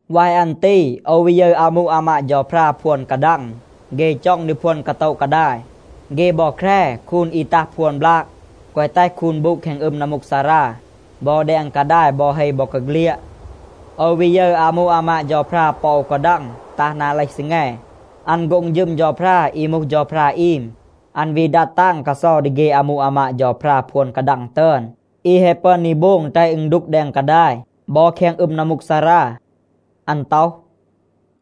วาย อัน ตี โอว วี ยึร อามู อามาด เฌาพรา พวน กาดัง. เฆ จ็อง ดี พวน กาโตะ กาดาย. เฆ บอ แคร คูน อี ตัห พวน บลาก, แกวะ แตห คูน บูด แคง อึม นัมมูกซารา บอ แดง กาดาย บอ เฮ บอกาเฆลียด. โอว วี ยึร อามู อามาด เฌาพรา ปอ อู กาดัง ตัห นา เลห ซีแง. อัน โฆ็ง ฌึม เฌาพรา อี มูห เฌาพรา อีม. อัน วี ดัด ตาง กาเซา ดี เฆ อามู อามาด เฌาพรา พวน กาดัง ตึอน อี แฮะ ปึอน ดี โบง แตห อึณ ดูก แดง กาดาย บอ แคง อึม นัมมูกซารา. อัน ต็อห,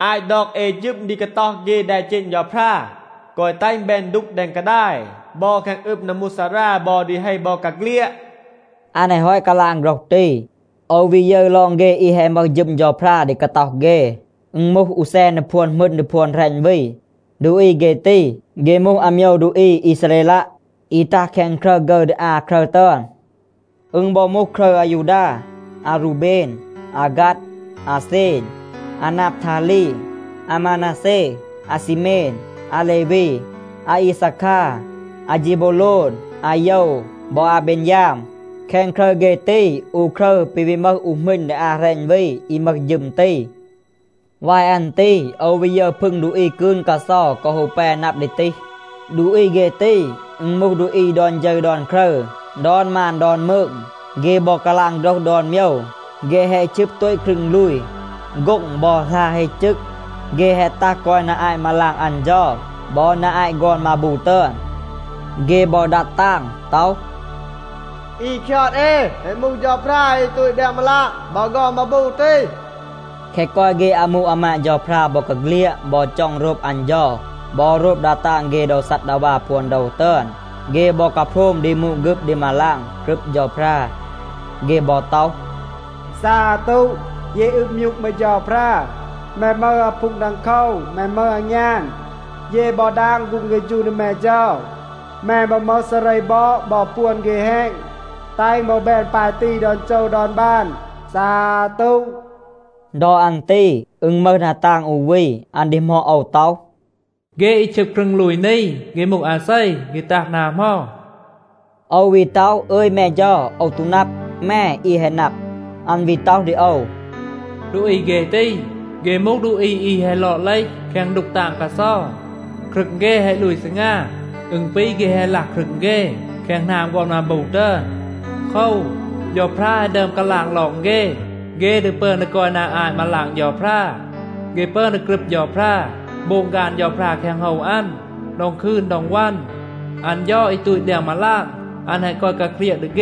“อาต ดอก เอ ฌึม ดี กาต็อห เฆ แดเจณ เฌาพรา, แกวะ แตห อึณ แบน ดูก แดง กาดาย บอ แคง อึม นัมมูกซารา บอ ดี เฮ บอกาเฆลียด.” อัน แฮะ ฮอต กาลาง โฆรห ตี, โอว วี ยึร ลอง เฆ อี แฮะ มึห ฌึม เฌาพรา ดี กาต็อห เฆ, อึณ มูห อู แซน ดี พวน หมึณ ดี พวน แหรณ วี. ดูอี เฆ ตี, เฆ มูห อาโมยว ดูอี อีซาเรลัะ, อี ตัห แคง ครึร ฆึร ดี อา ครึร ตึอน. อึณ บอ มูห ครึร อายูดา, อารูเบน, อาฆัด, อาเซน, อานาบทาลี, อามานาเซ, อาซีเมน, อาเลวี, อาอีซาคา, อาเฌบูโลน, อาโยว บอ อาเบนยาม. แคง ครึร เฆ ตี, อู ครึร ปี วี มึห อู หมึณ ดี อา แหรณ วี, อี มึห ฌึม ตี. วาย อัน ตี โอว วี ยึร พึง ดูอี กืน กาเซา กอ ฮู แป นับ ดี ตีห. ดูอี เฆ ตี, อึณ มูห ดูอี ดอน ฌึร ดอน ครึร, ดอน มาน ดอน มืง, เฆ บอ กาลาง โฆรห ดอน โมยว. เฆ แฮะ ชึบ โตต ครึง ลูย, โฆ็ง บอ หลา เฮ จึก. เฆ แฮะ ตัห กอย นา อาต มาลาง อัน เฌา บอ นา อาต ฆอน มาบู ตึอน. เฆ บอ ดัด ตาง ต็อห, “อี คยอด เอ แฮะ มูห เฌาพรา อี ตูต แดง มาลาง บอ ฆอน มาบู ตี.” แคะ กอย เฆ อามู อามาด เฌาพรา บอกาเฆลียด บอ จ็อง โรบ อัน เฌา บอ โรบ ดา ตาง เฆ โดว ซัดดาวา พวน โดว ตึอน, เฆ บอ กาโพรม ดี มูด ฆึบ ดี มาลาง, กรึบ เฌาพรา. เฆ บอ ต็อห, “ซาตู, เย อืบ มยูก แม เฌาพรา. แม มึห อาพูง ดังโคว. แม มึห อางยาน. เย บอ ดาง ฆูง เฆฌู ดี แม เฌา. แม บอ มึห ซาเร บอด บอ ปวน เฆ แฮณ. แตห อึณ บอ แบน ปาย ตี ดอน โจว ดอน บาน, ซาตู.” ดอ อัน ตี อึณ มึห ดา ตาง อู วี, อัน ดีหมอด โอว ต็อห, “เฆ อี ชึบ ครึง ลูย นี, เฆ มูห อาเซ? เฆ ตัห นา เหมา?” โอว วี ต็อห, “อึย แม เฌา, โอว ตู นับ. แม อี แฮะ นับ.” อัน วี ต็อห ดี โอว, “ดูอี เฆ ตี, เฆ มูห ดูอี อี แฮะ ลอด เลห แคง ดูก ตาง กาเซา. ครึง เฆ แฮะ ลูย ซีงา. อึณ ปี เฆ แฮะ ลัห ครึง เฆ แคง หนาม ฆอน มาบู ตึอน. โคว, เฌาพรา แฮะ ดึอม กาลาง ลอง เฆ, เฆ ดี ปึอน ดี กอย นา อาต มาลาง เฌาพรา. เฆ ปึอน ดี กรึบ เฌาพรา, โบง ฆาน เฌาพรา แคง โฮว อัน ดอง คืน ดอง วัน. อัน เฌา อี ตูต แดง มาลาง, อัน แฮะ กอย กาเครียะ ดี เฆ,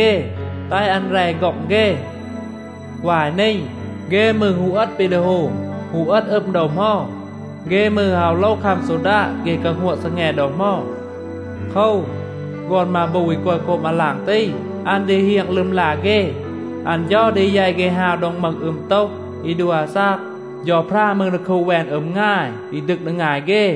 แตห อัน แร ฆ็อง เฆ. วาย นี, เฆ มืร ฮู เอต ปี ดี โฮม, ฮู เอต อึม ดอ เหมา. เฆ มืร อาว ฮู โลว คัม ซอดาด เฆ กาฮัวะ ซีแง ดอ เหมา. โคว, ฆอน มาบู อี กอย โคบ มาลาง ตี, อัน ดี เฮียง ลึมลา เฆ. อัน เฌา ดี แยต เฆ ฮาว โดง มึห อึม โตห อี ดัว อาซาก. เฌาพรา มืร ดี คูด แวน อึม งาย อี ดึก ดี งาย เฆ.”